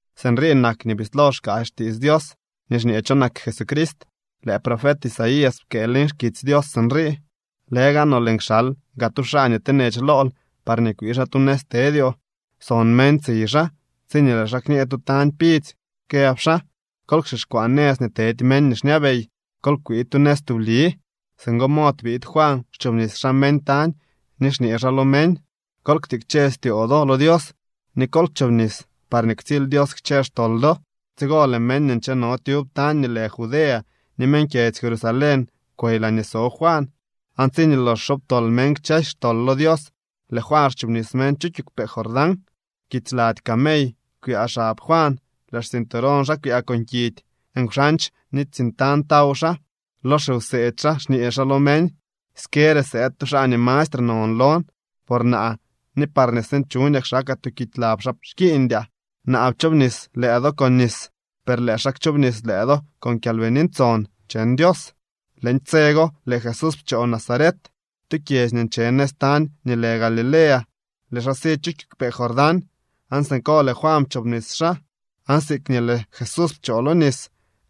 Sinrii nak nii bislo xkaasy xtiits Dios nii xñee cho nak Jesucrist. Lëë profet Isaías pkëë leñ xkitsy Dios sinrii: Lëgaanoo lëën kxal gaa tu xaa nii tenech lool parñee kwii xaa tu nëz tedyoo. Son meñ tsiy xaa tsiñee lëë xaa kñee tu tañ pidzy këb xaa: “Kol kxixkwaa nëz nii tedy meñ nii xñabey. Kol kwii tu nëz tubli.” Singo mod biid Juan xchoobnis xaa meñ tañ ni xñee xaa lo meñ: —Kol ktikche styoo do lo Dios ni kol chobnis, parñee ktsily Dios kchë xtol do. Tsigo lëë meñ nii ncheno tyub tañ nii lë Judea ni meñ kyedzy Jerusalén kwey laañee so Juan. Aan tsiñee lox xobtol meñ kchësy xtol lo Dios lëë Juan xchoobnis meñ chu kiigwpee Jordán. Kits lady camey kwyaa xab Juan, lëë xcinturón xaa kwyaa con kidy. Nkwxandx ni tsiñ tañ taw xaa. Lo xiwseedy xaa xñee xaa lo meñ: —Skere sëëd tu xaa nii mastre non lon, por naa ni parñee sinchuñaa kxakaa tuu kidy lab xaa xkiiñdyaa. Naa pchoobnis lëë do con nis. Per lëë xaa kchoobnis lëë do con Kyalbini Ntson cheñ Dios. Leñ tse go lëë Jesús pchoo Nazaret, tu kyedzy nii nche nëz tañ nii lë Galilea, lëë xaa si chu kiigwpee Jordán aan siko lëë Juan pchoobnis xaa. Aan siikñee lëë Jesús pchoo lo nis,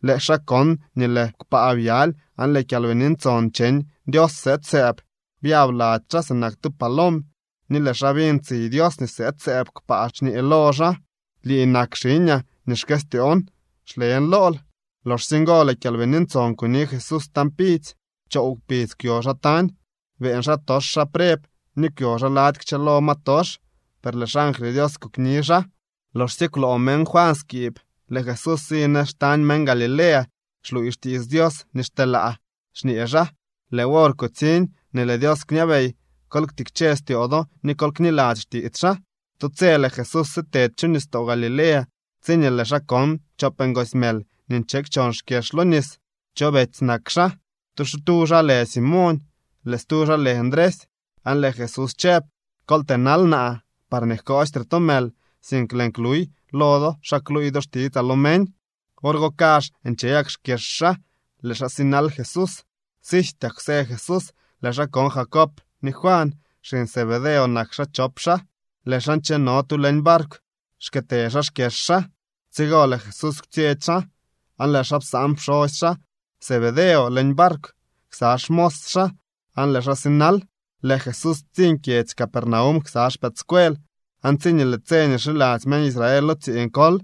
lëë xaa kon nii lëë kpaa byaly aan lëë Kyalbini Ntson cheñ Dios sëëd sëëb byab lady xaa sinak tu palom. Ni lëë xaa biñ tsiy Dios nii sëëd sëëb kpaa xñee lo xaa: —Lii nak xiñaa nii xkëstyoon. Xlen lool. Loxsye ngo lëë Kyalbini Ntson kuni Jesús tañ pidzy. Choow kpidz kwyo xaa tañ. Beeñ xaatox xaa preb ni kwyo xaa lady kchëlo ma tox, per lëë xangly Dios kokni xaa. Loxsye kwloo meñ Juan skiib, lëë Jesús si nëz xtañ meñ Galilea xluuy xtiits Dios nii xteelaa xñee xaa: —Lëë wor kutsiñ nii lëë Dios kñabey. Kol ktikche styoo do ni kol kniladzy xtiits xaa. Tu tse lëë Jesús sitedy chu nistoo Galilea tsiñee lëë xaa kon chop ngoosy mël nii nche kchon xkyex lo nis. Chop betsy nak xaa. Tu xaa lë Simoñ, lëë stu xaa lë Ndresy. Aan lëë Jesús chëb: —Kol tënal naa parñee jkoostre to mël, sink lëën kluy lo do xa kluuy do xtitsaa lo meñ. Wor go kazh nche gak xkyex xaa, lëë xaa sinal Jesús. Sijtyak kwsë Jesús lëë xaa kon Jacob ni Juan. Xiñ Zebedeo nak xaa chop xaa. Lëë xaa ncheno tu leñ barkw xkëtë xaa xkyex xaa. Tsigo lëë Jesús kwtsyetsy xaa, aan lëë xaa psaan pxosy xaa Zebedeo leñ barkw ksa xmos xaa aan lëë xaa sinal. Lëë Jesús ptsiñ kyedzy Capernaum ksa xpëëdscuel. Aan tsiñee lëë tse nii xiladzy meñ Israel lo tsiiñ kol,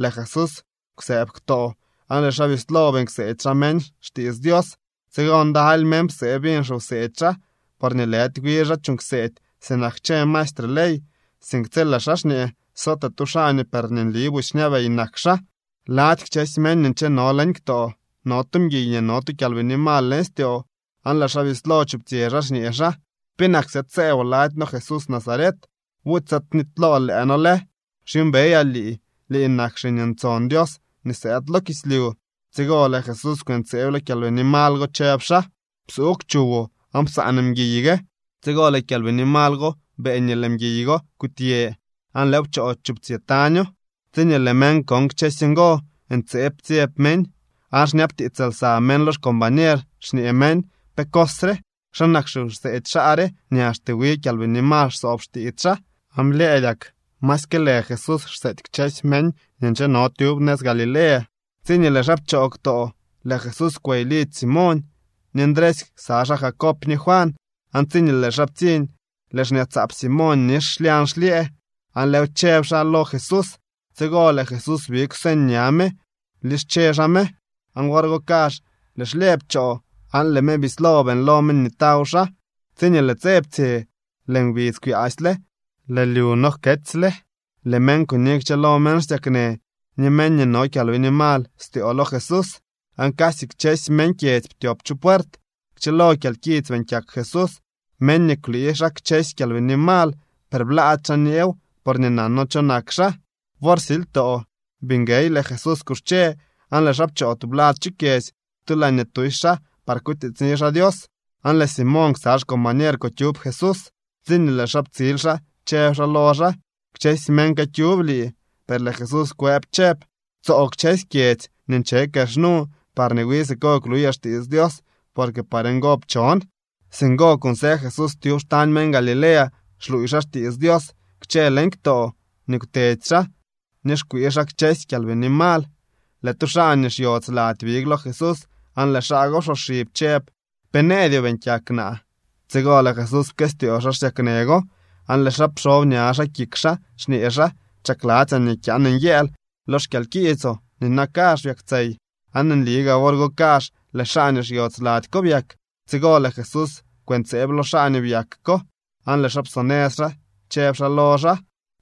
lëë Jesús kwsëëb ktoo aan lëë xaa bislo beeñ kseedy xaa meñ xtiits Dios. Tsigo ndaly meñ psee biñ xiwseedy xaa porñee lëdy wi xaa chuuñ kseedy sinak kchë maestre ley, sink tsi lëë xaa xñee sootee tu xaa nii per nli busy xñabey nak xaa. Lady kchësy meñ nii ncheno leñ ktoo no tu mguiy nii no tu kyalbini mal leñ styoo aan lëë xaa bislo chuptsyë xaa xñee xaa: —¿Penak sëëd sëëboo lady noo Jesús Nazaret? ¿Buty sëëd knitylool lëë noo lë? Xyuumbeyaa lii. Lii nak Xiñ Ntson Dios nii sëëd lo kislyu. Tsigo lëë Jesús kwëntseeb lo kyalbini mal go chëb xaa: —¡Psuugw chuwoo aan psaan mguiy gue! Tsigo lëë kyalbini mal go beeñ nii lëë mguiy go kutyë aan lëëw pchoo chuptsyë taño. Tsiñee lëë meñ kon kchësy ngo, ntseeb ptsyeb meñ, aan xñabtiits lsa meñ lo xcombañer xñee meñ: —¿Pe cos re? ¿Xa nak xiwseedy xaa re nii axte wi kyalbini mal xsoob xtiits xaa? Aan blyëëdyak masyke lë Jesús xseety kchësy meñ nii ncheno tyub nëz Galilea. Tsiñee lëë xaa pchoo ktoo, lëë Jesús kwey lidzy Simoñ ni Ndresy ksa xaa Jacob ni Juan. Aan tsiñee lëë xaa ptsiñ, lëë xñaatsaap Simoñ nix xlyañ xlyëë, aan lëëw chëb xaa lo Jesús. Tsigo lëë Jesús big kwseñ ña me blische xaa me. Aan wor go kazh lëë xlyëë pchoo, aan lëë me bislo beeñlo me nii taw xaa. Tsiñee lëë tse ptsye, lëë ngbidz kwyaasyle, lëë lyu no jketsyle, lëë meñ kuni kchëlo meñ xsyaknë ni meñ nii no kyalbini mal styoo lo Jesús, aan casy kchësy meñ kyedzy ptyop chu puert. Kchëlo kyalkits beeñ kyak Jesús meñ ni kwlii xaa kchësy kyalbini mal. Per blaady xaa nyeew porñee nano cho nak xaa. Wor silytoo bii nguey lëë Jesús kuxche aan lëë xaa pchoo tublad chu kyedzy tu laañee tusy xaa par kutiitsni xaa Dios. Aan lëë Simoñ ksa xcombañer kukyub Jesús. Tsiñee lëë xaa ptsil xaa chëb xaa lo xaa: —Kchësy meñ këkyub lii. Per lëë Jesús kwëb chëb: —Tsoo kchësy kyedzy nii nche kex nu parñee wi siko kluyaa xtiits Dios porque par ngo pchon. Singo kunsë Jesús tyub xtañ meñ Galilea xluuy xaa xtiits Dios kchë leñ ktoo nii kwtedy xaa ni xkwii xaa kchësy kyalbini mal. Lëë tu xaa nii xyodz lady big lo Jesús aan lëë xaa go psoxib chëb: —¿Pe nëëdyoo beeñ kyak naa? Tsigo lëë Jesús pkëstyoo xaa xsyaknë go, aan lëë xaa pxob ña xaa kik xaa xñee xaa: —Chakladzyaa nii kyaan nyëël lo xkyalkiitsoo. Nina kazh byaktsey. Aan nli gaa wor go kazh lëë xaa nii xyodz lady ko byak. Tsigo lëë Jesús kwëntseeb lo xaa nii byak ko aan lëë xaa psonëz xaa chëb xaa lo xaa: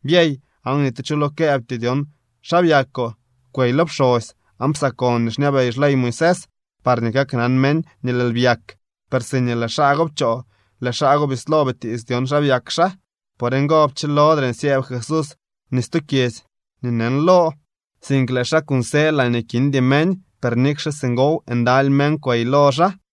—Byey aan ni tu cho lo këëbtyoo dyon xa byakoo. Kwey lo pxosy aan psakon nii xñabey xley Moisés, parñee kaknan meñ nii lëël byak. Per siñee lëë xaa go pchoo lëë xaa go bislo bitiits dyon xa byak xaa. Por ngo pchilodre nsyëëb Jesús ni stu kyedzy nii neñlo, sink lëë xaa kunsë laañee kindy meñ. Per nikxe singow ndaly meñ kwey lo xaa.